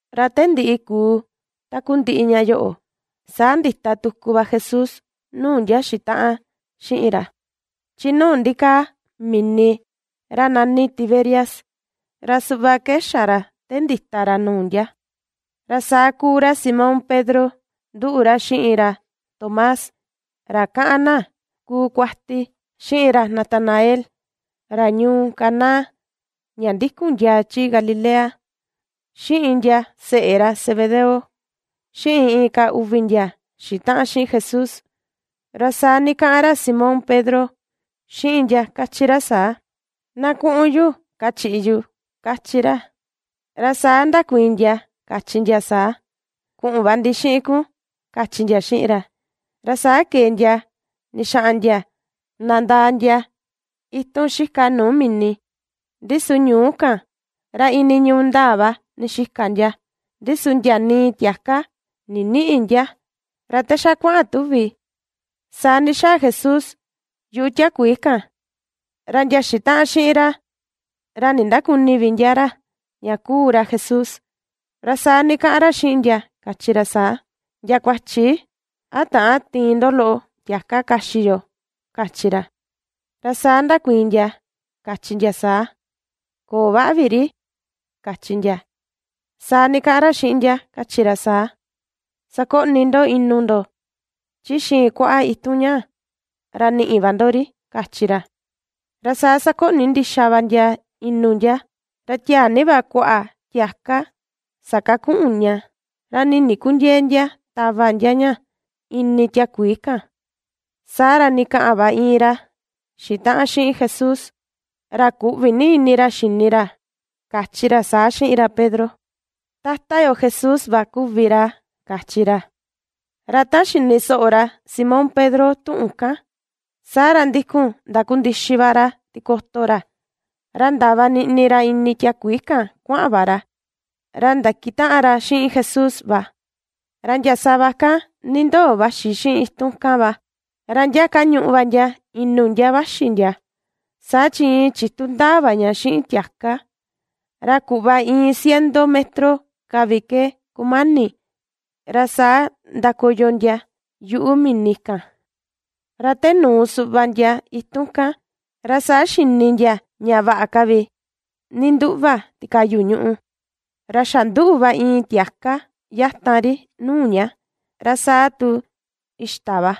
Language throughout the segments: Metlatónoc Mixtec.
Ra te ndiꞌi kuu takundiꞌi ña yoꞌo, saa ndita tuku va Jesús nuu ndia xitaꞌan xiꞌin ra, chi nuu ndikaa mini ra nani Tiberias. Ra suꞌva ke xa ra te ndita ra nuu ndia: ra saa kuu ra Simón Pedro, nduꞌu ra xiꞌin ra Tomás, ra kaꞌan na kuu kuati, xiꞌin ra Natanael, ra ñuu Caná ña ndikun ndiaa chi Galilea, xiꞌin ndia seꞌe ra Zebedeo, xiꞌin inka uvi ndia xitaꞌan xiꞌin Jesús. Ra saa ndikaꞌan ra Simón Pedro, xiꞌin ndia kachi ra saa: ―Na kuꞌun yu kachiꞌi yu ―kachi ra. Ra saa ndakuiin ndia, kachi ndia saa: ―Kuꞌun va ndi xiꞌin kun ―kachi ndia xiꞌin ra. Ra saa kee ndia ndixaꞌan ndia nandaa ndia itun xika nuu mini, ndi su ñuú kan, ra iin niñuu ndaa va ndixika ndia, ndi su ndia nii tiaka ndinïꞌi ndia. Ra te xa kuaꞌan tuvi, saa ndixaa Jesús yuꞌu tiakuii kan, ra ndia xitaꞌan xiꞌin ra, ra nindäkuni vi ndia ra ña kuu ra Jesús. Ra saa ndikaꞌan ra xiꞌin ndia, kachi ra saa: ―Ndia kuachi, ¿a täan tiin ndo loꞌo tiaka kaxi yo? ―kachi ra. Ra saa ndakuiin ndia, kachi ndia saa: ―Köo vaꞌa vi ri ―kachi ndia. Saa ndikaꞌan ra xiꞌin ndia, kachi ra saa: ―Sakoꞌni ndo inu ndo, chi xiin kuaꞌa itun ñaa, ra niꞌi va ndo ri ―kachi ra. Ra saa sakoꞌni ndixa va ndia inu ndia, ra tiaa ni va kuaꞌa tiaka sakakuꞌun ña, ra nii ndikundiëe ndia tava ndia ña, ini tiakuii kan. Saa ra ndikaꞌan va iin ra xitaꞌan xiꞌin Jesús, ra kuꞌvi ni ra xini ra, kachi ra saa xiꞌin ra Pedro: ―¡Tata yo Jesús va kuvi ra! ―kachi ra. Ra ta xini soꞌo ra Simón Pedro tuꞌun kan, saa ra ndikun ndakundixi va ra tikoto ra, ra ndava niꞌni ra ini tiakuii kan kuaꞌan ra ndakitaꞌan ra xiꞌin Jesús va. Ra ndia sava kan nindoo vaxi xiꞌin itun kan va, ra ndia kañuꞌu va ndia inu ndia vaxi ndia, saa chi iin chitu ndaa va ña xiꞌin tiaka; ra kuꞌva iin ciento metro ka vi ke kumani, ra saa ndakoyo ndia yuꞌu mini kan. Ra te nuu suꞌva ndia itun kan, ra saa xini ndia ña vaꞌa ka vi ninduꞌva tikayu ñùꞌù, ra xa nduꞌu va iin tiaka yatan ri nuu ña, ra saa tu xita va.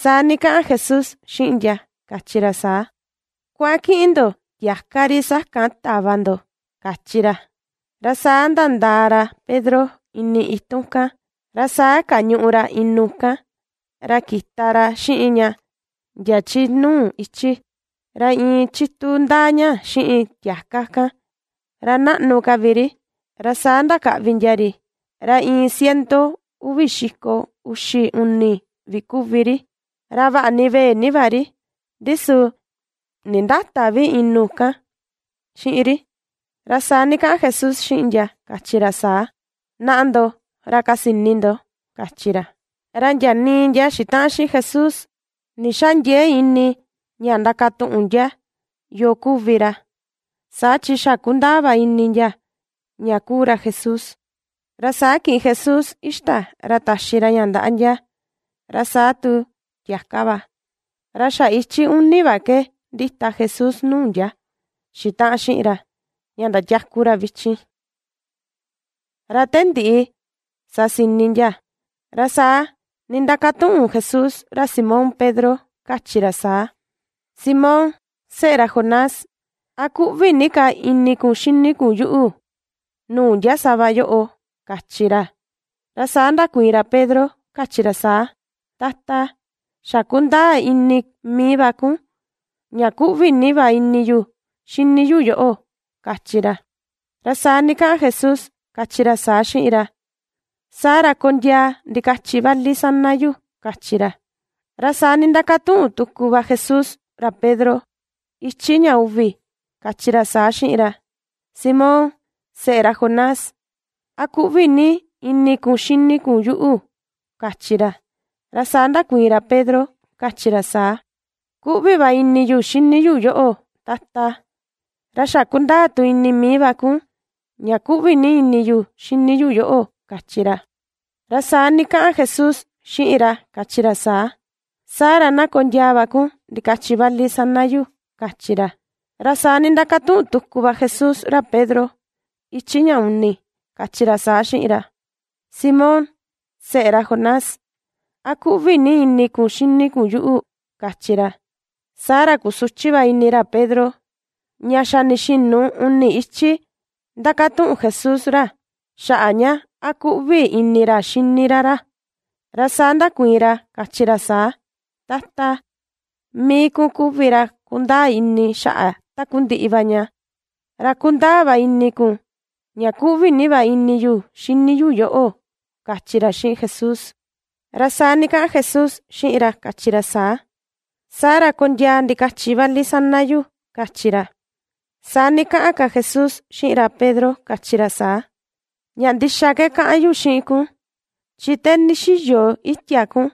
Saa ndikaꞌan Jesús xiꞌin ndia, kachi ra saa: ―Kuaꞌan kiꞌin ndo, tiaka ri sakan tava ndo ―kachi ra. Ra saa nandaa ra Pedro ini itun kan, ra saa kañuꞌu ra inu kan; ra kita ra xiꞌin ña ndia chi nuu ichi. Ra iin chitu ndaa ña xiꞌin tiaka kan, ra naꞌnu ka vi ri, ra saa ndakaꞌvi ndia ri, ra iin ciento uvi xiko uxi uni vi kuvi ri, ra vaꞌa ni vee ni va ri, ndi su nindäta vi inu kan xiꞌin ri. Ra saa ndikaꞌan Jesús xiꞌin ndia, kachi ra saa: ―Naꞌa ndo, ra kasini ndo ―kachi ra. Ra ndia nii ndia xitaꞌan xiꞌin Jesús, ndixändiee ini ña ndakatuꞌun ndia yoo kuvi ra, saa chi xa kundaa va ini ndia, ña kuu ra Jesús. Ra saa kiꞌin Jesús xita, ra taxi ra ña ndaꞌa ndia, ra saa tu tiaka va. Ra xa ichi uni va ke ^ndita Jesús nuu ndia xitaꞌan xiꞌin ra, ña ndatiaku ra vichin. Ra te ndiꞌi sasini ndia, ra saa nindakatuꞌun Jesús ra Simón Pedro, kachi ra saa: ―Simón, seꞌe ra Jonás, ¿a kuꞌvi ni ka ini kun xini kun yuꞌu, nuu ndia sava yoꞌo? ―kachi ra. Ra saa ndakuiin ra Pedro, kachi ra saa: ―Tata, xa kundaa ini mii va kun, ña kuꞌvi ni va ini yu, xini yu yoꞌo ―kachi ra. Ra saa ndikaꞌan Jesús, kachi ra saa xiꞌin ra: ―Saa ra kondiaa ndikachi vali sana yu ―kachi ra. Ra saa nindakatuꞌun tuku va Jesús ra Pedro, ichi ña uvi, kachi ra saa xiꞌin ra: ―Simón, seꞌe ra Jonás, ¿a kuꞌvi ni ini kun xini kun yuꞌu? ―kachi ra. Ra saa ndakuiin ra Pedro, kachi ra saa: ―Kuꞌvi va ini yu xini yu yoꞌo, Tata, ra xa kundaa tu ini mii va kun, ña kuꞌvi ni ini yu xini yu yoꞌo ―kachi ra. Ra saa ndikaꞌan Jesús xiꞌin ra, kachi ra saa: ―Saa ra na kondiaa va kun ndikachi vali sana yu ―kachi ra. Saa ra nindakatuꞌun tuku va Jesús ra Pedro, ichi ña uni, kachi ra saa xiꞌin ra: ―Simón, seꞌe ra Jonás, ¿a kuꞌvi ni ini kun xini kun yuꞌu? ―kachi ra. Saa ra kusuchi va ini ra Pedro, ña xa ndixinu uni ichi ndakatuꞌun Jesús ra, xaꞌa ña, a kuꞌvi ini ra xini ra ra. Ra saa ndakuiin ra, kachi ra saa: ―Tata, mii kun kuvi ra kundaa ini xaꞌa takundiꞌi va ña, ra kundaa va ini kun, ña kuꞌvi ni va ini yu xini yu yoꞌo ―kachi ra xiꞌin Jesús. Ra saa ndikaꞌan Jesús xiꞌin ra, kachi ra saa: ―Saa ra kondiaa ndikachi vali sana yu ―kachi ra. Saa ndikaꞌan ka Jesús xiꞌin ra Pedro, kachi ra saa: ―Ña ndixa ke kaꞌan yu xiꞌin kun: chi te ndixiyo itia kun,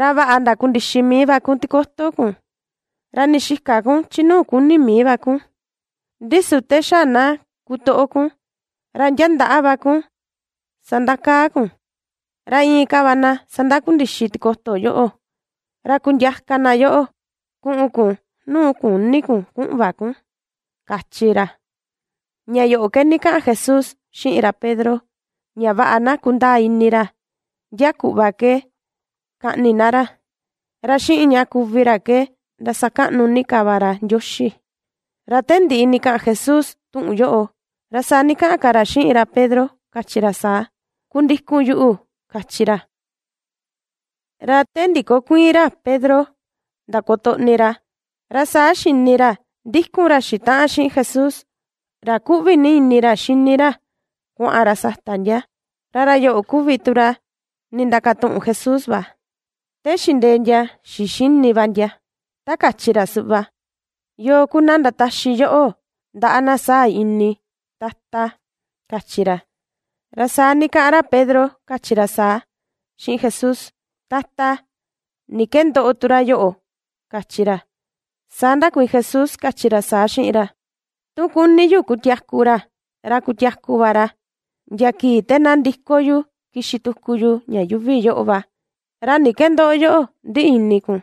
ra vaꞌa ndakundixi mii va kun tikoto kun, ra ndixika kun chi nuu kuni mii va kun, ndi su te xa na kutoꞌo kun, ra ndia ndaꞌa va kun sandakaa kun, ra inka va na sandakundixi tikoto yoꞌo, ra kundiaka na yoꞌo, kuꞌun kun nuu küni kun kuꞌun va kun ―kachi ra. Ña yoꞌo ke ndikaꞌan Jesús xiꞌin ra Pedro, ña vaꞌa na kundaa ini ra, ndia kuꞌva ke kaꞌni na ra, ra xiꞌin ña kuvi ra ke ndasakaꞌnu ni ka va ra Ndioxi. Ra te ndiꞌi ndikaꞌan Jesús tuꞌun yoꞌo, ra saa ndikaꞌan ka ra xiꞌin ra Pedro, kachi ra saa: ―Kundikun yuꞌu ―kachi ra. Ra te ndikokuiin ra Pedro ndakutoꞌni ra, ra saa xini ra ndikun ra xitaꞌan xiꞌin Jesús, ra kuꞌvi ni ini ra xini ra, kuaꞌan ra sata ndia. Ra ra yoꞌo kuvi tu ra nindakatuꞌun Jesús, te xindee ndia xixini va ndia, ta kachi ra suꞌva: “¿Yoo ku na ndataxi yoꞌo, ndaꞌa na saa ini, Tata?” ―kachi ra. Ra saa ndikaꞌan ra Pedro kachi ra saa, xiꞌin Jesús: ―Tata, ¿ni ke ndoꞌo tu ra yoꞌo? ―kachi ra. Saa ndakuiin Jesús, kachi ra saa xiꞌin ra: ―Tu kuni yu kutiaku ra, ra kutiaku va ra, ndia kii te na ndiko yu kixi tuku yu ña yuuvi yoꞌo va, ¿ra ni ke ndoꞌo yoꞌo ndiꞌi ini kun?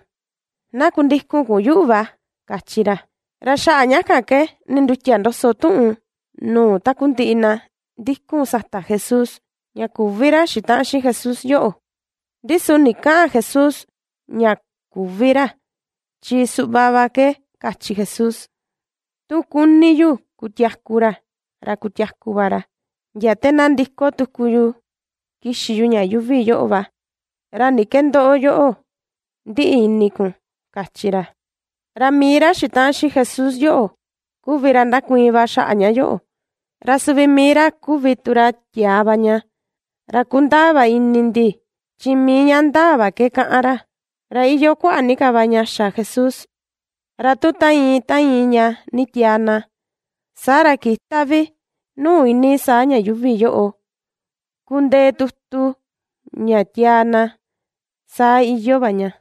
Na kundikun yuꞌu va ―kachi ra. Ra xaꞌa ña kan ke, ndindutia ndoso tuꞌun nuu takundiꞌi na ndikun sata Jesús, ña küvi ra xitaꞌan xiꞌin Jesús yoꞌo. Ndi su ndikäꞌan Jesús ña küvi ra, chi suꞌva va ke kachi Jesús: “Tu kuni yu kutiaku ra, ra kutiaku va ra, ndia te na ndiko tuku yu kixi yu ña yuuvi yoꞌo va, ¿ra ni ke ndoꞌo yoꞌo, ndiꞌi ini kun?”, kachi ra. Ra mii ra xitaꞌan xiꞌin Jesús yoꞌo, kuvi ra ndakuiin va xaꞌa ña yoꞌo, ra suvi mii ra kuvi tu ra tiaa va ña. Ra kundaa va ini ndi, chi mii ña ndaa va ke kaꞌan ra. Ra iyoo kuaꞌa ni ka va ña xa Jesús, ra tu ta iin, ta iin ña nditiaa na, saa ra kïta vi nuu iinii saa ña yuuvi yoꞌo, kundee tutu ña tiaa na. Saa iyoo va ña.